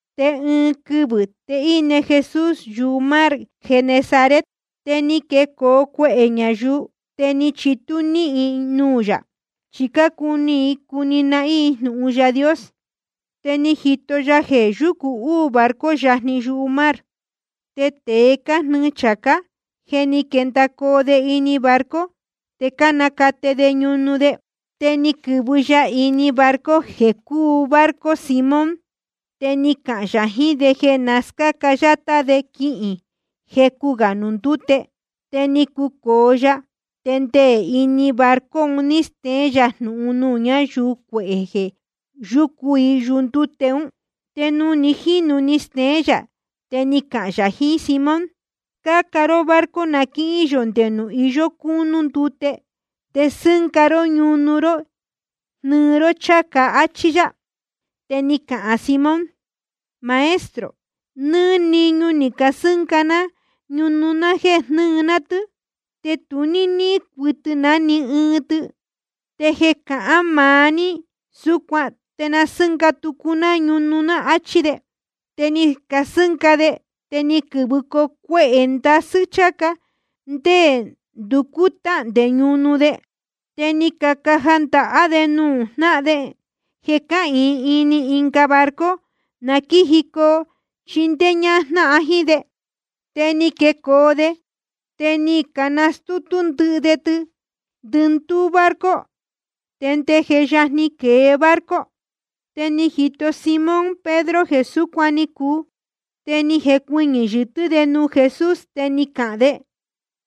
Te ɨɨn quɨvɨ̄ te íne Jesús yumar Genesaret. Te ni quecoo cuehē ñayuu, te ni chitú níhin i nuū yā, chi cácuni i cuni nahín i jnūhun Yaā Dios. Te ni jito ya jeē yúcu uū barco yajni yumar. Te tēe cájnɨɨ chācá, je ni quendacoo de ini barco, te cánacate de ñunu de. Te ni quɨ̄vɨ ya ini ɨɨn barco jeē cúu barco Simón. Te ni cahān yā jiín de jeē na scáca yátá de quihīn jecu gā nuū ndúte. Te ni cucōo ya, te nde ini barco un ní steén yā jnūhun nuū ñáyuu cuehē jeē yúcu i yundúte un. Te nuū ni jínu ni steén yā, te ni cahān yā jiín Simón: Scáca ró barco na quíhín yō nde nuū iyó cúnú ndute, te sɨ́nga ró ñunu ró jnɨɨ ró cháca, áchí yá. Te ni cahān Simón: Maestro, nɨ́ɨ́ niñu ni casɨ́nga ná ñunu jeē jnɨɨ ná tɨ́, te tu ní níhín cuɨtɨ ná ni ɨɨn tɨ. Te jeē cahán maá ní súcuan, te na sɨ́nga tucu ná ñunu, áchí de. Te ni casɨ́nga de, te ni quɨ̄vɨcoo cuehē ndasɨ́ cháca, nde nducú táhndē ñunu de. Te ni cacaja ndahá de nuū jnáhan de cáhīin ini ɨnga barco, na quíjicoo chindéé ñájnáhan jíín de. Te ni quecoo de, te ni cascútú ndɨ́ɨ̄ de tɨ ndɨndúú barco, te nde je yajni quēe barco. Te ni jito Simón Pedro jeē súcuan ni cuu. Te ni jecuɨñɨ̄ yɨtɨ́ de nuū Jesús, te ni cahān de: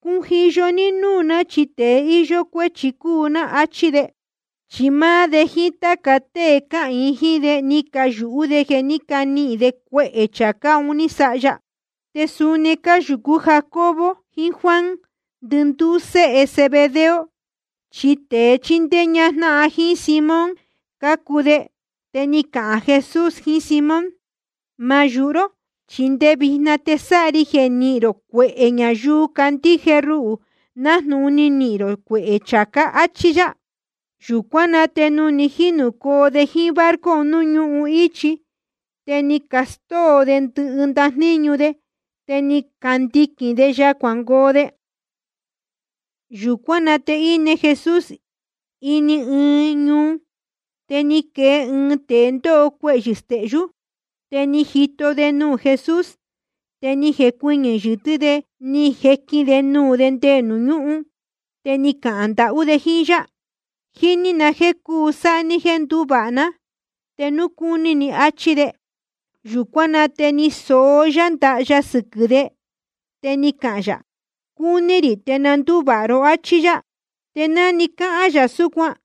Cujiyo ní núū ná, chi tēe íyó cuéchi cúu ná, áchí de. Chi máá de jíín táca tée cáhīin jíín de, ni cayūhú de jeē ní canihīn de cuehē chācá un ní sáha ya. Te suni ni cayūhú Jacobo jiín Juan, ndɨndúú séhe Zebedeo, chi tēe chíndéé ñájnáhan jíín Simón cácuu de. Te ni cahān Jesús jiín Simón: Ma yūhu ró, chi nde vijna te sáha ri jeē nihīn rō cuehē ñayuu candíje ruhū, nájnūhun ni nihīn rō cuehē chācá. Achí yá. Yūcuán na te nuū ni jínūcoo de jíín barco nuū ñúhun íchi, te ni castóo de ndɨhɨ ndajníñu de, te ni candiquīn de ya cuangoo de. Yūcuán na te íne Jesús ini ɨɨn ñuu, te ni quee ɨɨn tēe ndóho cuehyɨ̄ stehyú. Te ni jito de nuū Jesús, te ni jecuɨñɨ̄ yɨtɨ́ de ni jequīn de nuū de nde nuū ñúhun, te ni cahān ndahú de jíín yá: Jíní na jéē cuu sáha ní jéē nduvāha ná, te núu cúní ni, áchí de. Yūcuán na te ni soó yá ndaha ya sɨquɨ̄ de, te ni cahān yā: Cúní rī. Te na ndúvāha ró, áchí yá. Te ná ni cahān yā súcuan,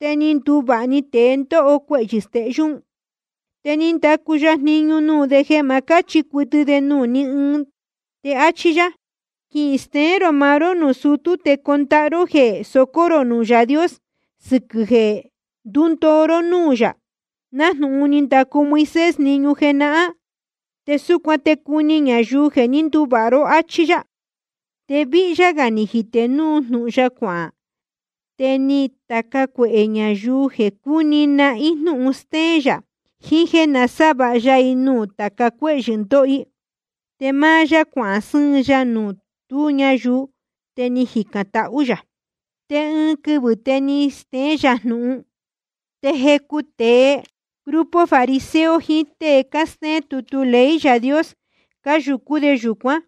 te ni nduvāha‑ni tēe ndóho cuehyɨ̄ stehyú un. Te ni ndacu ya jniñu nuū de jeē ma cáchi cuɨtɨ de nuū ní ɨɨn. Te áchí yá: Quisteén rō maá ró nuū sutú, te condahá ró jeē socó rō nuū Yaā Dios sɨquɨ̄ jeē ndúndoo ró núū yā, nájnūhun ni ndacu Moisés jniñu jenahán. Te súcuan te cuni ñayuu jeē ní nduvāha ró. Achí yá. Te víhyá gā ni jitē núu jnūhun ya cuahān. Te ni cataca cuehē ñayuu jeē cúni nahín i jnūhun stéén yā, jiín jéē nasávāha ya i nuū tāca cuéhyɨ̄ cándoho i. Te máá yá cuahān sɨ́ɨn ya nuū tú ñayuu, te ni jicān tahú yā. Te ɨɨn quɨvɨ̄ te stéén yā jnūhun, te jecu tēe grupo fariseo jiín tée cástéén tutu ley Yaā Dios, cáyūcú de yūcuán.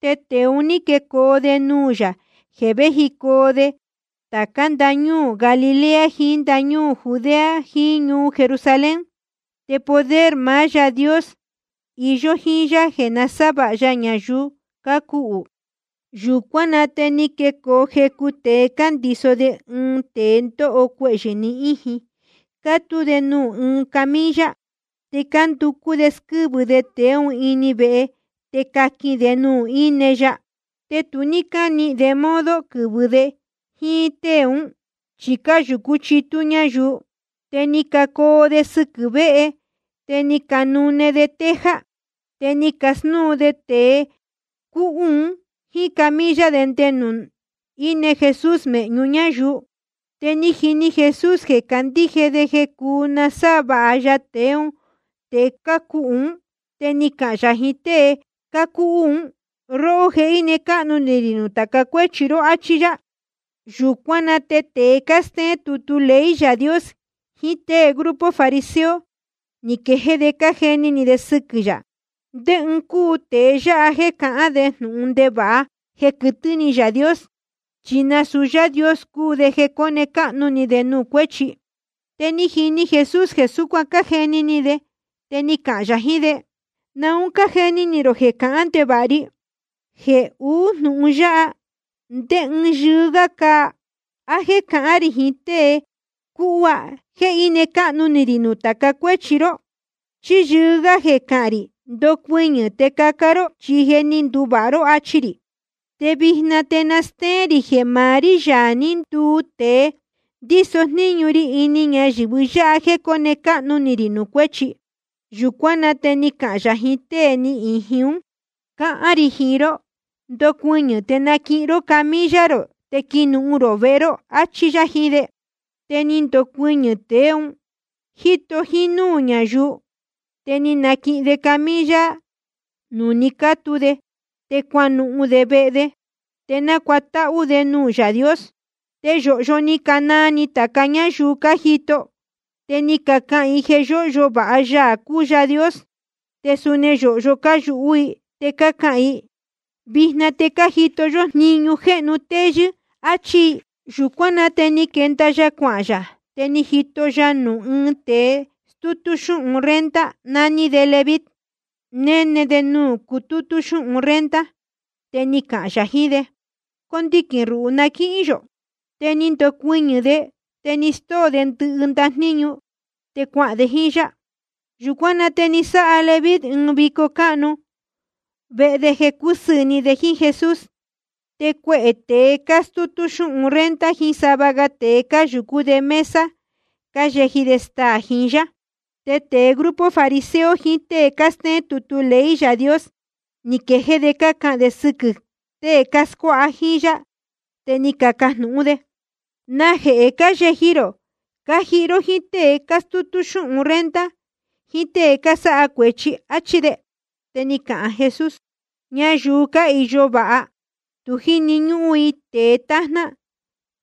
Te tēe un ní quecoo de nuū yā jeē véjicoo de tācá ndañúū Galilea, jiín ndañúū Judea, jiín ñuu Jerusalén. Te poder maá Yaā Dios iyó jíín yá jeē nasávāha ya ñayuu cácuhū. Yūcuán na te ni quecoo jecu tēe, cándiso de ɨɨn tēe ndóho cuehyɨ̄ ni íjin, cátú de nuū ɨɨn camilla. Te cánducú de squɨ́vɨ de tēe ún ini vehe, te caquin de nuū íne ya. Te tu ní cánihīn de modo quɨ̄vɨcoo de jíín tée un, chi cáyūcú chitú ñáyuu. Te ni cacoo de sɨquɨ̄ véhe, te ni canune de teja. Te ni cascúun de tēe cúhú un jíín camilla de nde nuū íne Jesús mēhñu ñáyuu. Te ni jini Jesús jeē cácandíje de jeē cúu nasávāha ya tēe cúhú un. Te ni cahān yā jiín tée cúhú un: Róhó, je íne cáhnu ni rī nuū tāca cuéchi ró, áchí yá. Yūcuán na te tēe cástéén tutu ley Yaā Dios jiín tée grupo fariseo, ni quejéé de cájeni ni de sɨquɨ̄ yā: ¿Ndé ɨɨn cúu tēe yáha jéē cahán de jnūhun ndevāha jeē quɨtɨ́ ni Yaā Dios? Chi nasūu Yáā Dios cúu de jeē cóne cáhnu ni de nuū cuéchi. Te ni jini Jesús jeē súcuan cájeni ni de, te ni cahān yā jiín de: ¿Naun cájeni ni rō jeē cahán ndevāha ri? Jeē uú jnūhun yáha, ¿ndé ɨɨn yɨɨ́ gá cáa? ¿A jéē cahán rī jiín tée cúhú: Je íne cáhnu ni rī nuū tāca cuéchi ró? ¿Chí yɨɨ́ gá jeē cahān rī: Ndocuɨñɨ̄ te caca ró, chi je ni nduvāha ró, achi rī? Te vijna te na stéén rī jeē maá rí, Yaā ní nduu tēe, ndíso jníñu ri ini ñayɨ̄vɨ yáha jéē cóne cáhnu ni rī nuū cuéchi. Yūcuán na te ni cahān yā jiín tée ni íjin ún: Cáhán rī jiín ró, ndocuɨñɨ̄ te naquihin ró camilla rō, te quinuhun rō vehe ró, áchí yá jiín de. Te ni ndocuɨñɨ̄‑ni tēe ún, jíto jínúū ñayuu. Te ni naquihin de camilla nuū ni cátu de, te cuanuhun de vehe de. Te nácuatáhú de nuū Yaā Dios. Te yōhyo ni canaa ni tāca ñáyuu cájito i, te ni cacahān i jeē yóhyo vāha Yaā cúu Yaā Dios. Te suni yōhyo cáyūhú i, te cácahān i: Vijna te ni cajito yó jniñu jéhnu téyɨ́, áchí i. Yūcuán na te ni quenda ya cuahān yā, te ni jito ya nuū ɨɨn tēe stútú xúhun renta, naní de Leví, néne de nuū cutútú xúhun renta. Te ni cahān yā jiín de: Condiquīn ruhū na quíhín yō. Te ni ndocuɨñɨ̄ de, te ni stóo de ndɨhɨ ndajníñu de, te cuahān de jíín yá. Yūcuán na te ni sáha Leví ɨɨn vico cáhnu vehe de, jeē cúsɨɨ̄ ni de jíín Jesús. Te cuehē tēe cástútú xúhun renta jiín sava ga tēe, cáyūcú de mesa cáyeji de staā jiín yá. Te tēe grupo fariseo jiín tée cástéén tutu ley Yaā Dios, ni quejéé de cácahān de sɨquɨ̄ tée cáscuáha jíín yá, te ni cacajnūhún de: ¿Najehē cáyeji rō cájihi ró jíín tée cástútú xúhun renta jiín tée cásáha cuēchi? áchí de. Te ni cahān Jesús: Ñayuu cáhīyo vāha, tu jíni ñúhún i tēe tájná,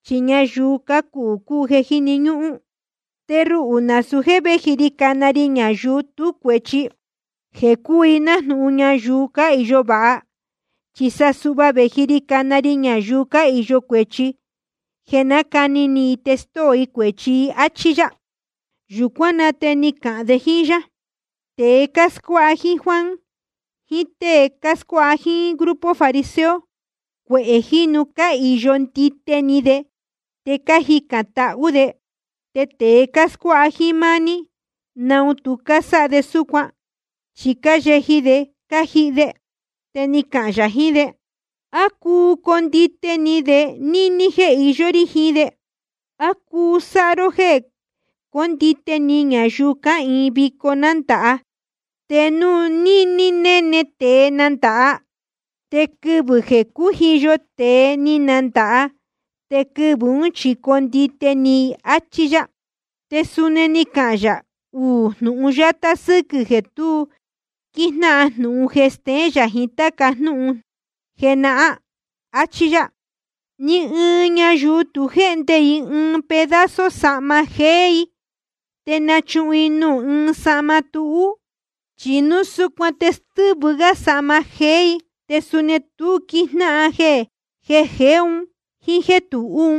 chi ñayuu cácuhū cúu jeē jíni ñúhún. Te ruhū nasūu jéē véji ri cana ri ñayuu tú cuēchi, jeē cúu i nájnūhun ñayuu cáhīyo vāha. Chi sa suhva vēji ri cana ri ñayuu cáhīyo cuēchi, jeē na nácani ni i te stóo i cuēchi i. Achí yá. Yūcuán na te ni cacahān de jíín yá: Tēe cáscuáha jíín Juan, jiín tée cáscuáha jíín grupo fariseo, cuehē jínu cáhīyo ndite ni de te cájicān tahú de. Te tēe cáscuáha jíín máá ní, ¿naun tu cásáha de súcuan? Chi cáyeji de cájihi de. Te ni cahān yā jiín de: ¿A cuu condite ni de níní jéē iyó rí jiín de? ¿A cuu sáha ró jéē condite ni ñayuu cáhīin vico nándāha, te núu níní néne tēe nándāha? Te quee quɨvɨ̄ jeē cújiyo tēe ni nandāha, te quɨvɨ̄ ún chi condite ni i. Achí yá. Te suni ni cahān yā uū jnūhun yátá sɨ́quɨ̄ jeē tu quíjnáhan jnūhun jeé jéē steén yā jiín táca jnúhun jenahán. Achí yá: Ni ɨɨn ñayuu tu jéhnde i ɨɨn pedazo sahma jéé i, te nachuhun i nuū ɨɨn sahma túhú i. Chi núu súcuan te stɨ́vɨ i sahma jéé i, te suni tu quíjnáhan jeē jeé un jíín jéē tuhú.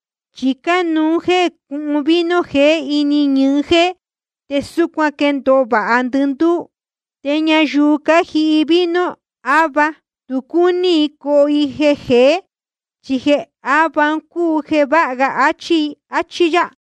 Chi cánuú jéē cúhun vino jeé ini ñɨɨ jéé, te súcuan te quéndōo vāha ndɨndúú. Te ñayuu cájihi vino áva, tu cúní i coho i jeē jeé, chi jeē áva cúu jeē váha ga, achí i. Achí yá.